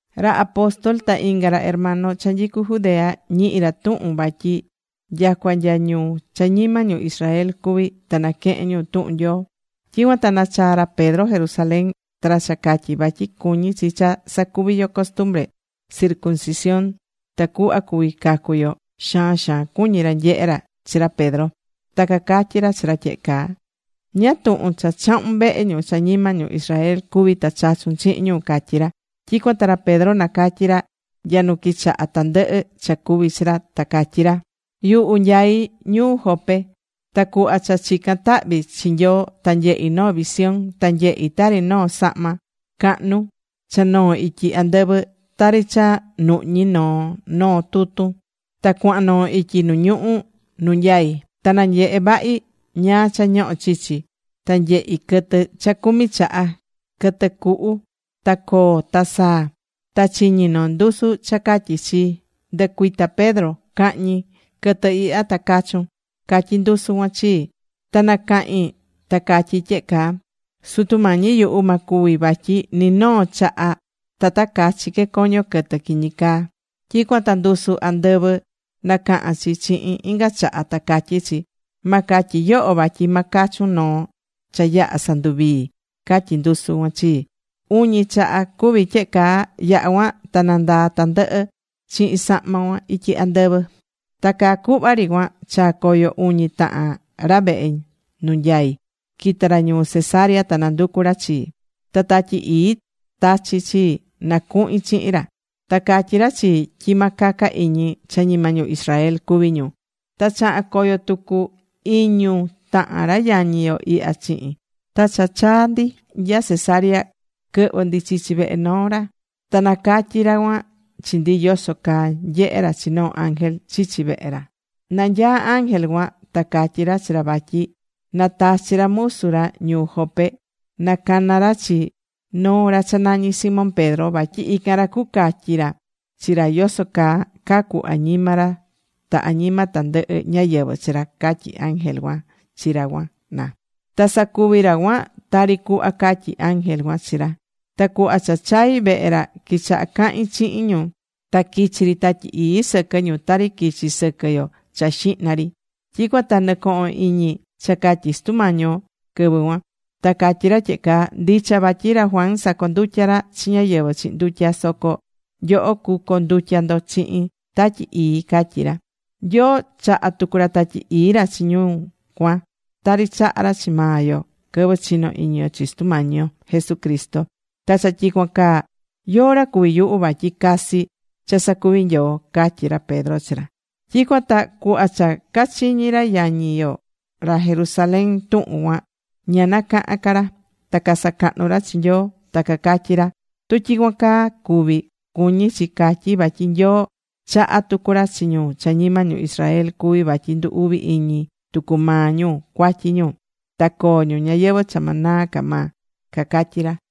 Ra apóstol ta inga ra hermano cha nyicú Judea, ñihi̱ ra tuhun vatyi nyacua nya ñu cha ñima ñu Israel cuví ta naquehén ñu tuhun Nyoo. Tyicuan ta nachaa̱ ra Pedro Jerusalén. Ta ra cha catyí vatyi cuñí chi cha sacuvi yo costumbre circuncisión ta cuhva cuvi cacu yo, xaan xaan cuñí ra nyehe ra chi ra Pedro. Ta cacatyí ra chi ra tyehe caa: ―¿Ñáá tuhun cha chahu̱n vehe ñu cha ñima ñu Israel cuví ta chachu̱n chihin ñu? ―catyí ra. Tyicuan ta ra Pedro nacatyí ra nya nu quichaha tandɨhɨ cha cuvi̱ chi ra ta catyí ra: ―Yuhu nyaí ñuu Jope. Ta cuhva cha chicán tahvi chi Nyoo ta nyehi̱ noo visión. Ta nyehi̱ tari noo sahma cahnu cha noó ityi andɨvɨ. Tari cha nuhñí noo noo tutun ta cuahan noo ityi nu ñuhú nu nyaí. Ta nanyehe̱ vahi ñáá cha ñohó chichi. Ta nyehi̱ quɨtɨ cha cumi chaha, quɨtɨ cuhu, ta coo, ta saa. Ta chiñi̱ noo ndusu cha catyí chii: “Ndɨ̱cuita Pedro. Ca̱hñi quɨtɨ ihya ta ca̱chun”, catyi ndusu cuan chii. Ta nacahi̱n ta catyi̱ tyehe caa: “Sutu Mañi yuhu, ma cuvi, vatyi ni noo chaha ta ta cachi que coño quɨtɨ quiñi caa.” Tyicuan ta ndusu andɨvɨ nacaha̱n chi chihin inga chaha, ta catyí chi: “Ma catyi yoho vatyi ma cachun noo cha yaha̱ sanduvii̱”, catyí ndusu cuan chi. Uñi chaha cuvi̱ tyehe caa. Yaha̱ cuan ta nandaa̱ tandɨhɨ chihin sahma cuan ityi andɨvɨ. Ta caa cuhva ri cuan chaa̱ coyo uñi tahan ra vehe nu nyaí, quita̱ ra ñuu Cesarea ta nanducu̱ ra chii. Ta Tatyi Ii tachi̱ chii na cuhin chihin ra. Ta catyi̱ ra chii tyi ma caca iñi cha ñima ñu Israel cuví ñu. Ta chaha̱n coyo tucu iñu tahan ra yañi yo ihya chihin. Ta cha chaa̱ ndi nya Cesarea quɨhvɨ̱ ndi chichi vehe noo ra. Ta nacatyi̱ ra cuan chi ndi yoso caa nyehe̱ ra chi noo ángel chichi vehe ra. Nanyaá ángel cuan ta catyi̱ ra chi ra vatyi na tachi ra musu ra ñuu Jope na cana ra chi noo ra cha nañi Simón Pedro. Vatyi ican ra cucatyi ra chi ra yoso caa cacu añima ra ta añima tandɨhɨ ñáyɨvɨ chi ra, catyí ángel cuan chi ra cuan na. Ta sacuvi̱ ra cuan tari cuhva catyi̱ ángel cuan chi ra. Ta cuhva cha chai̱ vehe ra quichaha cahín chihin ñu. Ta quichi̱ ri Tatyi Ii sɨquɨ ñu tari quichi̱ sɨquɨ yo cha xihna ri. Tyicuan ta nɨcoho̱n iñi cha catyi̱ Sutu Mañi yo quɨvɨ cuan. Ta catyí ra tyehe caa: “Ndicha vatyi ra Juan sacondutya̱ ra chi ñáyɨvɨ chihin ndutya. Soco nyoho cucondutya ndo chihin Tatyi Ii”, catyí ra. Nyoo chaha̱ tucu ra Tatyi Ii ra chi ñu cuan tari chaha̱ ra chi maa yo quɨvɨ chino iñi yo chi Sutu Mañi yo Jesucristo. Ta cha tyicuan caa ¿yóó ra cuvi yuhu vatyi casi cha sacuví Nyoo? ―catyí ra Pedro chi ra. Tyicuan ta cuhva cha cachiñi̱ ra yañi yo ra Jerusalén tuhun cuan ña nacaha̱n ca ra. Ta casacahnu̱ ra chi Nyoo. Ta cacatyí ra: ―Tu tyicuan caa cuvi̱, cuñí chi catyi vatyi Nyoo chahá tucu ra chi ñu cha ñima ñu Israel cuví vatyi ndu uvi iñi tucu maa ñu cuatyi ñu, ta coo ñu ñayɨvɨ̱ cha ma naa ca maa ―cacatyí ra.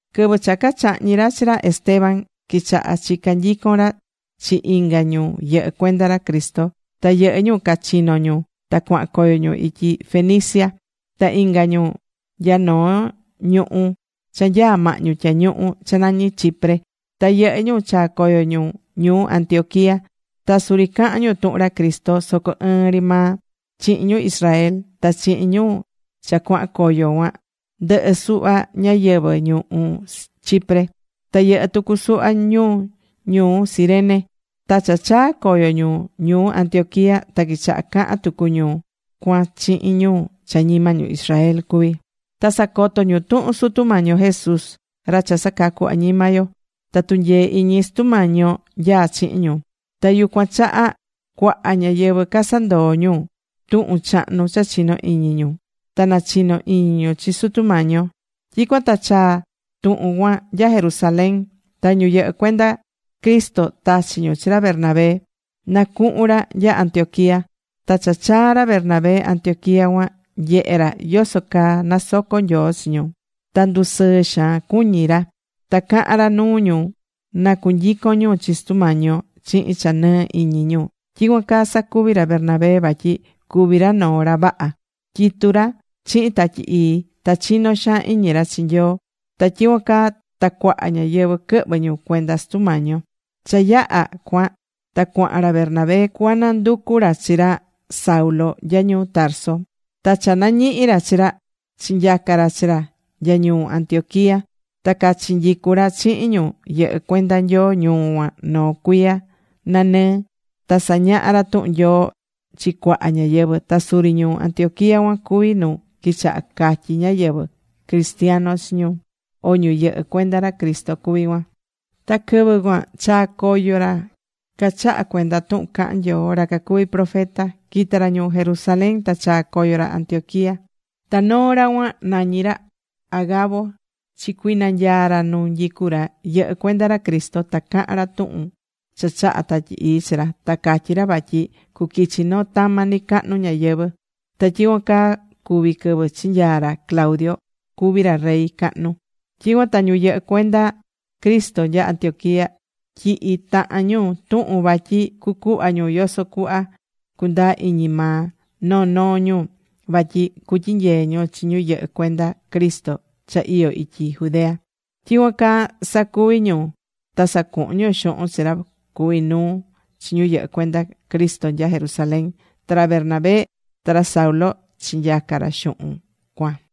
Quɨvɨ cha cachahñi̱ ra chi ra Esteban, quichaha chica nyicon ra chi inga ñu yɨhɨ́ cuenda ra Cristo. Ta yɨhɨ́ ñu cachino̱ ñu ta cuahan coyo ñu ityi Fenicia. Ta inga ñu nya noo ñuhú cha nyaá mahñu tyañuhu cha nañí Chipre. Ta yɨhɨ́ ñu chaa̱ coyo ñu ñuu Antioquía. Ta suri cahan ñu tuhun ra Cristo soco ɨɨn ri maa chihin ñu Israel. Ta chihin ñu cha cuahan coyo cuan, ndɨhɨ́ suhva ñáyɨvɨ ñuhú Chipre. Ta yɨhɨ tucu suhva ñu ñuu Cirene. Ta cha chaa̱ coyo ñu ñuu Antioquía, ta quichaha cahan tucu ñu cuan chihin ñu cha ñima ñu Israel cuví. Ta sacoto ñu tuhun Sutu Mañi yo Jesús, ra cha sacacu añima yo. Ta tunyee iñi Sutu Mañi yo nyaa chihin ñu. Ta yucuan chaha cuaha ñáyɨvɨ casandoo̱ ñu tuhun chahnu cha chino̱ iñi ñu. Ta nachino iñi ñu chi Sutu Mañi yo. Tyicuan ta chaa̱ tuhun cuan nya Jerusalén. Ta ñu yɨhɨ́ cuenda Cristo tachi̱ ñu chi ra Bernabé na cuhun ra nya Antioquía. Ta cha chaa̱ ra Bernabé Antioquía cuan, nyehe̱ ra yoso caa nasocó Nyoo chi ñu. Ta ndusɨɨ xaan cuñí ra. Ta cahán ra nuu ñu na cunyicon ñu chi Sutu Mañi yo chihin cha nɨɨ iñi ñu. Tyicuan caa sacuvi̱ ra Bernabé vatyi cuví ra noo ra vaha. Tyitú ra chihin Tatyi Ii. Ta chinó xaan iñi ra chi Nyoo. Ta tyicuan caa ta cuaha ñáyɨvɨ quɨhvɨ̱ ñu cuenda Sutu Mañi yo. Cha yaha cuan ta cuahan ra Bernabé cuananducu ra chi ra Saulo nya ñuu Tarso. Ta cha nañihi̱ ra chi ra, chinyaca ra chi ra nya ñuu Antioquía. Ta cachinyicu̱ ra chihin ñu yɨhɨ́ cuenda Nyoo ñuu cuan noo cuiya nanɨɨ ta sañaha̱ ra tuhun Nyoo chi cuaha ñáyɨvɨ. Ta suri ñuu Antioquía cuan cuvi nu quichaha catyi ñáyɨvɨ: Cristiano chi ñu, o ñu yɨhɨ́ cuenda ra Cristo cuví cuan. Ta quɨvɨ cuan chaa̱ coyo ra cachahá cuenda tuhun cahán Nyoo, ra cacuví profeta. Quita̱ ra ñuu Jerusalén ta chaa̱ coyo ra Antioquía. Ta noo ra cuan nañí ra Agabo chicuinanyaa̱ ra nu nyicú ra yɨhɨ́ cuenda ra Cristo ta cahan ra tuhun cha chaha̱ Tatyi Ii chi ra. Ta catyí ra vatyi cuquichi noo tama nicacahnu ñayɨvɨ̱. Ta tyicuan caa cuvi̱ quɨvɨ chinyaa̱ ra Claudio cuví ra rey cahnu. Tyicuan ta ñu yɨhɨ́ cuenda Cristo nya Antioquiá tyihi̱ tahan ñu tuhun vatyi cucuhva ñu yoso cuhva cundaa iñi maa noo noo ñu, vatyi cutyinyee ñu chi ñu yɨhɨ́ cuenda Cristo cha iyó ityi Judea. Tyicuan caa sacuvi̱ ñu ta sacuhu̱n ñu xuhun chi ra cuví nuu chi ñu yɨhɨ́ cuenda Cristo nya Jerusalén. Ta ra Bernabé ta ra Saulo chinyaca̱ ra xuhun cuan.